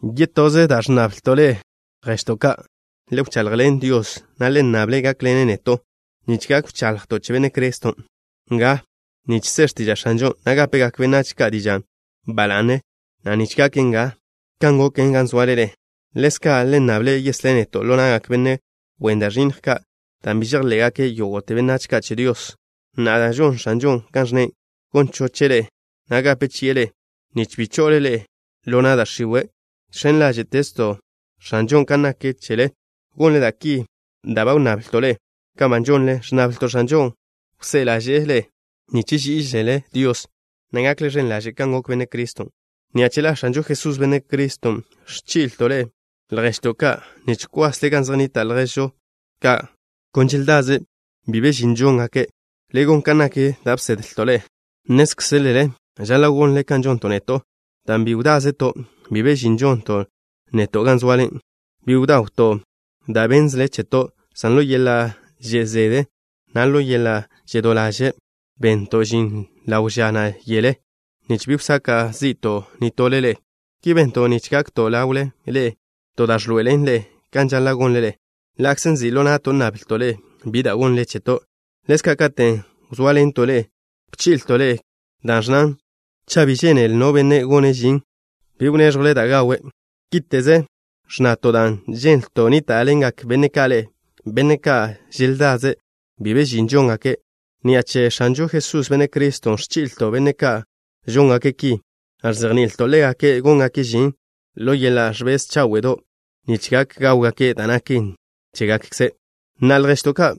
Yetoze, lježto' ka', le wchaḻjḻen Dios, na' le nnable' gákḻene' neto', nich gak wchaḻjto' che Benne' Criston' nga, nich se x̱tiža' X̱anžon', na' gápegak benách ka' dižan' ba la'ne, na' nich gaken nga kan goken gan zoale ḻe'e. Ḻezka' le nnable' yeslé' neto' ḻo na'gak benne' wen da' ẕinnj ka', dan' bi žejḻe'gak yógo'te benách ka' che Dios. Na'a, dan' žon X̱anžon' kan ẕnne', gon choche' ḻe'e, na' gape chi'e ḻe'e, nich bi cho'le ḻe'e ḻo na' da' x̱iwe'. Žx̱en ḻáže'to' X̱anžon' kan nak chele, gonle da' ki da' ba wnnablto' ḻe'e, kan ba žonlen. Ẕnnablto' X̱anžon' wsé'e ḻáže'le nich ží'iželele Dios, na' gakle ẕen ḻaže' kan gok Benne' Criston'. Ni'a che la X̱anžo Jesús, Benne' Criston', ẕchí'leto' ḻe'e, lježto' ka', nich kwasle gan zej nnita' lježžo ka' kon želdaze' bi be žin žóngake'. Le gon kan nak da' bsedlto' ḻe'e. Nnézkzelele žaḻa' gonle kan žonto' neto', dan' bi wdázeto' bi be žin žonto' neto' gan zoale. Bi bdawto' da' bénnzele cheto', san ḻo yeḻa' že' zede, na' ḻo yeḻa' žedó ḻaže', bento' žin ḻawe' ža, na' yele, nich bi wsaka' zi'to' nitole ḻe'e. Ki bento' nich gakto' ḻawle ḻe'e ka to da' ẕḻoe'elen ḻe'e kan žaḻa' gonle ḻe'e, ḻa'kze nzi' ḻo na'to' nnablto' ḻe'e bi da' gonle cheto'. Ḻezka' katen' wzóaḻento' ḻe'e, bchi'leto' ḻe'e ki, da' ẕnnan: “Cha' bi žénele no benne' gone' žin, bi gonnle da' gawe'.” Kíte'ze ẕnnato' dan' ženlto' nníta'ḻengak benne' ka' ḻe'e, benne' ka' kon želdaze', bi be žin žóngake'. Ni'a che X̱anžo Jesús, Benne' Criston', ẕchí'leto' benne' ka' žóngake' ki, na' ẕzejni'ilto' ḻégake' góngake' žin ḻo yeḻa' ẕbez cháwe'do', nich gak gáwgake' da' naken chégakkze'. Na'a, lježto' ka',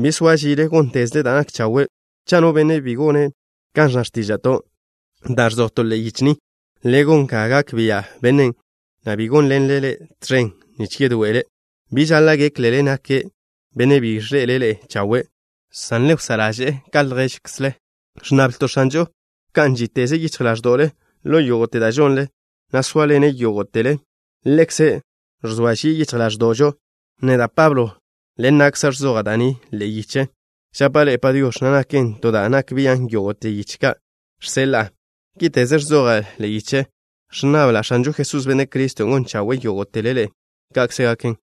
bi soa žile, góntezle da' nak chawe'. Cha' no benne' bi gone' kan ẕnna x̱tíža'to', da' ẕzojto' ḻe'e yiche ni, le gon ga gak bia' bennen', na' bi gónḻenle ḻe' tẕen nich yedoe'ele'. Bi žaḻa' géklele nake' benne' bi ẕḻe'ele' ḻe'e chawe', san le wsá' ḻaže'e ḻe' ka lježkzle. Ẕnnablto' X̱anžon' wká'n žíteze' yichj ḻáẕdo'le ḻo yógo'te da' žonle, na' sóaḻene' yógo'tele. Ḻekze' ẕzoa žie' yichj ḻáẕdo'žo. Neda', Pablo, ḻen na'kza' ẕzoja' da' ni ḻe'e yiche: žapa' ḻe'e “Padiox̱” na' naken to da' nak bian' yógo'te yiche ka' žseḻa'a. Kíte'ze ẕzoja' ḻe'e yiche. Ẕnnabla' X̱anžo Jesús, Benne' Criston', gon chawe'e yógo'tele ḻe'e. Ka'kze gaken.